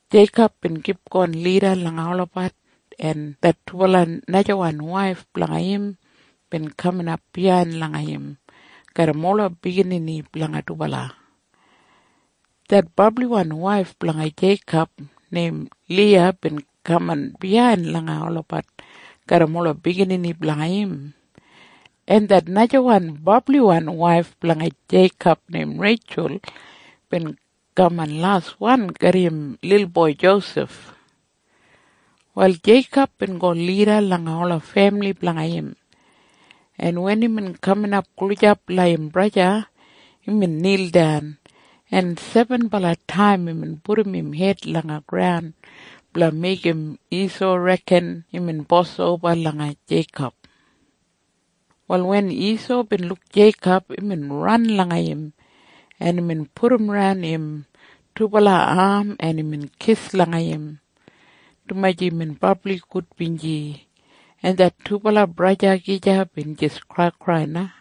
Jeikob bin kipgon lida langa olabat, en det dubala najawan waif blanga im bin kaman biyain langa im garram ola biginini blanga dubala. Det brabliwan waif blanga Jeikob neim Liya bin kaman biyain langa olabat garram ola biginini blanga im. En det najawan brabli waif blanga Jeikob neim Reitjul bin kaman laswan garram im lilboi Josef. Wal Jeikob bin go lida langa ola femili blanga im, en wen imbin kaman gulijap langa im braja, imbin nildan, en sebenbala taim imbin pudum im hed langa graun blanga meigim Isau reken imbin bos oba langa Jeikob. Wal wen Isau bin luk Jeikob, imbin ran langa im, en imbin pudumran im dubala am, en imbin kis langa im, dumaji imbin brabli gudbinji. En det dubala braja gija bin jis kraikrai na.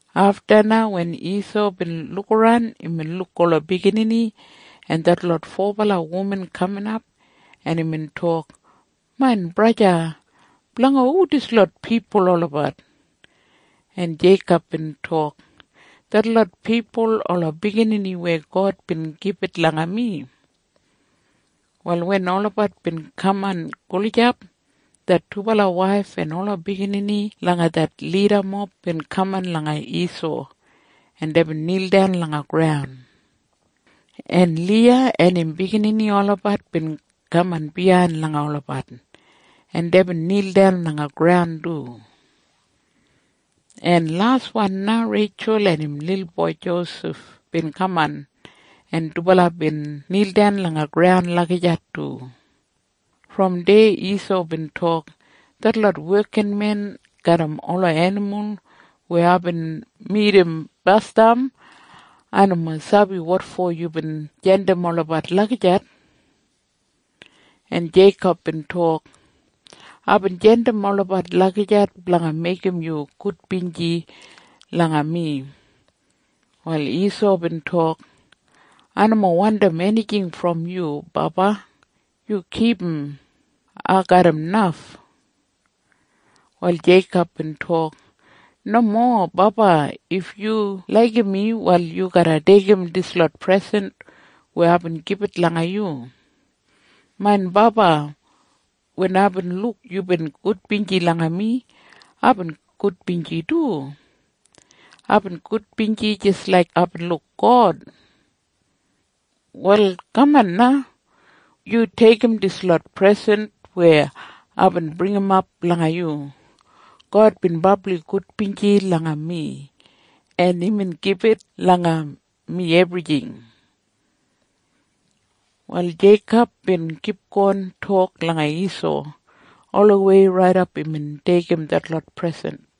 Afta na wen Isau bin lukaran, imbin luk ola biginini en detlot fobala wuman kaminap, en imbin tok, “Main braja, blanga hu dislot pipul olabat?” En Jeikob bin tok, “Detlot pipul ola biginini weya God bin gibit langa mi.” Wal wen olabat bin kaman gulijap, det dubala waif en ola biginini langa det lidamob bin kaman langa Isau, en deibin nildan langa graun. En Liya en im biginini olabat bin kaman biyain langa olabat, en deibin nildan langa graun du. En laswan na Reitjul en im lilboi Josef bin kaman, en dubala bin nildan langa graun lagijat du. Brom deya Isau bin tok, “Detlot wekinmen garram ola enimul weya aibin midim basdam, ai nomo sabi wotfo yubin jandim olabat lagijat.” En Jeikob bin tok, “Aibin jandim olabat lagijat blanga meigim yu gudbinji langa mi.” Wal Isau bin tok, “Ai nomo wandim enijing brom yu, baba. Yu kipum. Ai garram naf.” Wal Jeikob bin tok, “Nomo, baba. If yu laigim mi, wal yu garra deigim dislot presen weya aibin gibit langa yu. Main baba, wen aibin luk yubin gudbinji langa mi, aibin gudbinji du. Aibin gudbinji jis laik aibin luk God. “Wal kaman na. Yu deigim dislot presen weya aibin bringimap blanga yu. God bin brabli gudbinji langa mi, en imbin gibit langa mi ebrijing.” Wal Jeikob bin kipgon tok langa Isau olawei raidap imbin deigim detlot presen.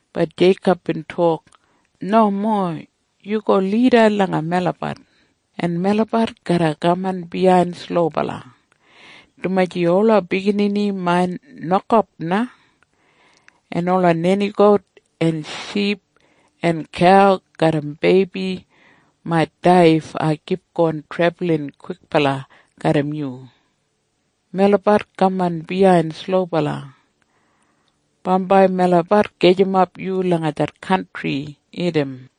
Bat Jeikob bin tok, “Nomo. Yu go lida langa melabat, en melabat garra kaman biyain slobala, dumaji ola biginini main nokap na, en ola nenigout en ship en kau garram beibi mait dai if ai kipgon trebulin kwikbala garram yu. Melabat kaman biyain slobala. Bambai melabat gajimap yu langa det kantri Idam.”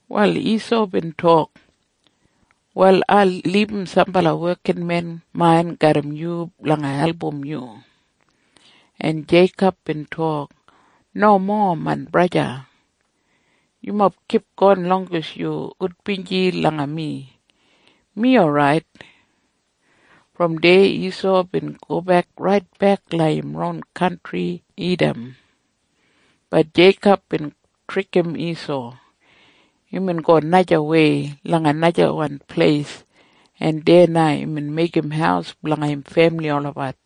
Wal Isau bin tok, “Wal ai libum sambala wekinmen main garram yu blanga album yu.” En Jeikob bin tok, “Nomo, main braja. Yumob kipgon longes yu gudbinji langa mi. Mi orait.” Brom deya Isau bin gobek raitbek langa im ron kantri Idam. Bat Jeikob bin trikim Isau. Imbin go najawei langa najawan pleis, en deya na imbin meigim haus blanga im femili olabat,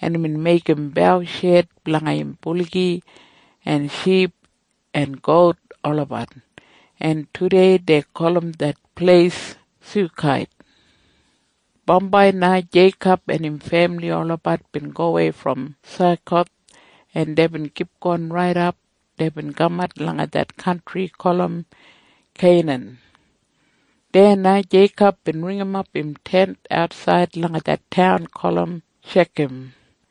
en imbin meigim bausheid blanga im buligi en ship en gout olabat. En tudei dei gulum det pleis Sukait. Bambai na Jeikob en im femili olabat bin gowei brom Sakoth, en deibin kipgon raidap deibin kamat langa det kantri gulum Keinan. Deya na Jeikob bin ringimap im tent atsaid langa det taun gulum Shekam,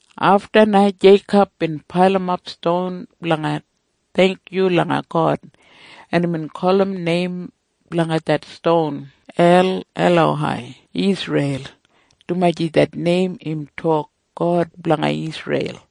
Afta na Jeikob bin pailimap ston blanga theingkyu langa God, en imbin gulum neim blanga det ston El Elohei Isreil, dumaji det neim im tok God Blanga Isreil.